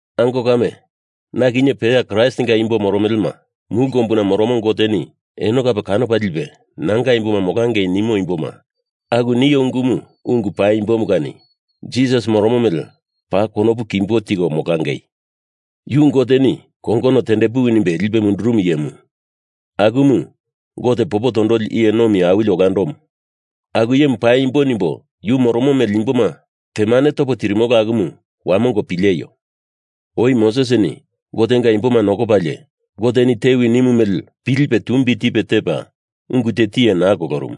Ango kame, na kinye peya Kraistinga imbo moromelema, mulu kombuna moromo Goteni eno kape kanopa lipe nanga imboma molangei nimo imboma aku nio ungumu ungu paimbomu kani Jisas moromo mele paa konopu kimbo tiko molangei. Yu Goteni kongono tendepuwi nimbe lipe mundurumu iyemu, akumu Gote Popo Tondoli Iye Nomi Awili Olandomu. Aku iyemu paimbo nimbo yu moromo mele imboma temane topo tirimolo akumu wamongo pileio! Oi Mosesini Gotenga imboma nokopalie Goteni tewi nimu mele pilipe tumbi tipe tepa ungu te tiye naa kolorumu.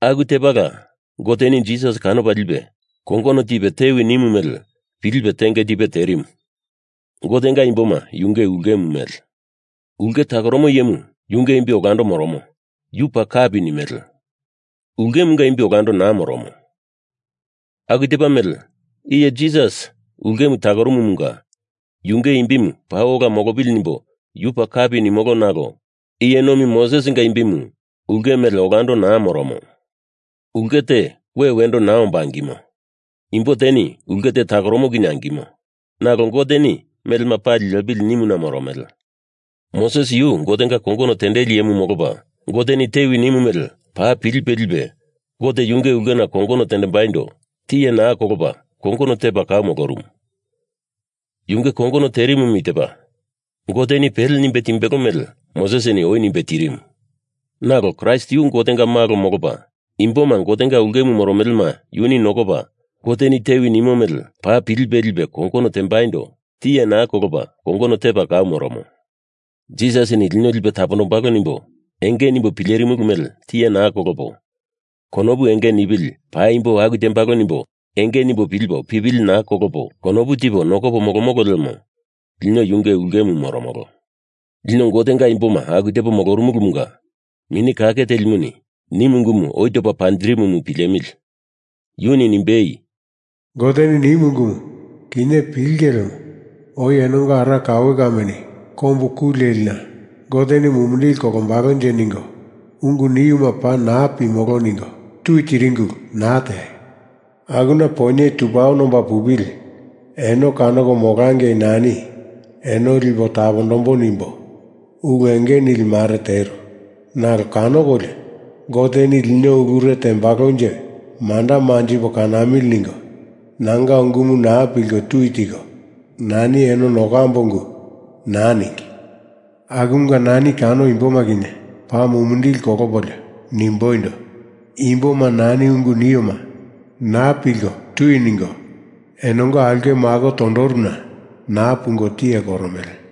Aku tepala Goteni Jisas kanopa lipe kongono tipe tewi nimu mele pilipe tenge tipe terimu. Gotenga imboma yunge ulkemu mele. Ulke takoromo iyemu yunge imbi olando moromo, yu paa kapi nimele. Ulkemunga imbi olando naa moromo. Aku tepa mele iye Jisas ulkemu takorumumunga yunge imbimu paa ola molopili nimbo yu paa kapi nimolo, nalo iye nomi Mosesinga imbimu ulke mele olando naa moromo. Ulke te we wendo naa omba angimo. Imbo teni ulke te takoromo kinye angimo. Nalo Goteni melema pali lepili nimuna moromele. Moses yu Gotenga kongono tendeli iyemu molopa Goteni tewi nimu mele paa pilipe lipe Gote yunge ulkena kongono tembaindo tiye naa kolopa kongono tepa kau molorumu. Yunge kongono terimu i tepa: Goteni pele nimbe timbelo mele Mosesini oi nimbe tirimu. Nalo Kraist yu Gotenga Malo molopa imboma Gotenga ulkemu moromelema yuni nokopa Goteni tewi nimo mele paa pilipe lipe kongono tembaindo tiye naa kolopa kongono tepa kau moromo. Jisasini lino lipe tapondombalo nimbo enge nimbo pilerimulu mele tiye naa kolopo, konopu enge nipili paimbo aku tembalo nimbo enge nimbo pilipo pipili naa kolopo, konopu tipo nokopo molomolo lemo lino yunge ulkemu moromolo. Lino Gotenga imboma aku tepo moromolomunga Mini Kake Telimuni nimu ungumu oi topa panjirimumu pilemili! Yuni nimbei, “Goteni nimu ungumu kinye pilinge lemo oi enonga ara kaue kameni kombu ku lelina Goteni mumindili kolombalonje ningo ungu niuma paa naa pimolo ningo tui tiringi ulu naa teaio. Akuna poinye tu paono omba pupili eno kanoko molangei nani eno lipo tapondambo nimbo ulu enge nili mare teru, nalo kanokolio Goteni lino ulure tembalonje manda manjipo kanamili ningo nanga ungumu naa pilko tui tiko, nani eno nokambo ungu naa ningi. Akumunga nani kano imboma kinye paa mumindili kolopolio nimboindo, i imboma nani ungu nioma naa pilko tui ningo enonga aulke mako tondoruna naa pungo tiye koromele.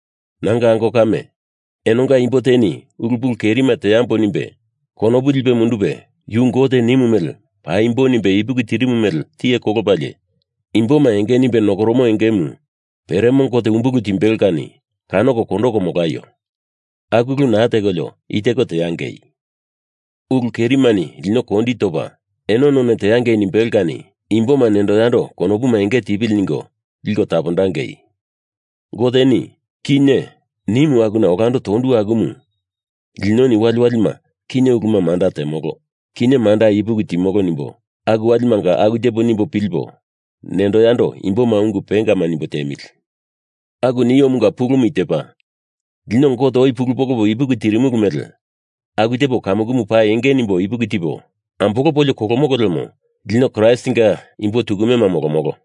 Nanga ango kame, enonga imbo teni ulu pulu kerima teambo nimbe konopu lipe mundupe yu Gote nimu mele paimbo nimbe ipuki tirimu mele tiye kolopalie imboma enge nimbe nokoromo engemu peremo Gote umbulu timbelo kani kanoko kondoko molaio. Aku ulu naa tekolio i teko teangei. Ulu kerimani lino kondi topa eno none teangei nimbelo kani imboma nendo yando konopuma enge tipili ningo liko tapondangei. Goteni “Kinye” nimu akuna olando tondu akumu linoni waliwalima kinye uluma manda temolo, kinye manda ipuki timolo nimbo aku walimanga aku tepo nimbo pilipo nendo yando imboma ungu pengama nimbo tiemili. Aku niomunga pulumu i tepa: Lino Gote oi pulu polopo ipuki tirimulu mele aku tepo kamukumu paa enge nimbo ipuki tipo ambolopolio kolomolo lemo lino Kraistinga imbo tukumema molomolo.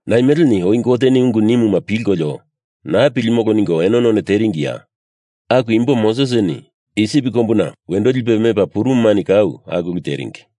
Naimeleni oi Goteni ungu nimuma pilkolio naa pilimolo ningo eno none teringiya? Aku imbo Mosesini Isip kombuna wendo lipe mepa purumumani kau aku ulu teringi.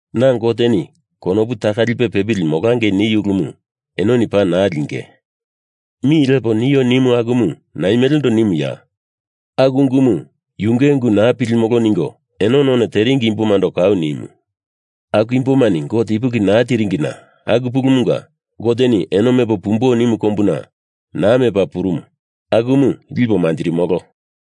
Na Goteni konopu taka lipe pepili molangei niu ulumu enoni paa naa linge mi lepo nio nimu akumu naimelendo nimuya? Aku ungumu yunge ungu naa pilimolo ningo eno none teringi imbomando kau nimu. Aku imbomani Gote ipuki naa tiringina aku pulumunga Goteni eno mepo pumbo nimu kombuna naa mepa purumu akumu lipo manjirimolo.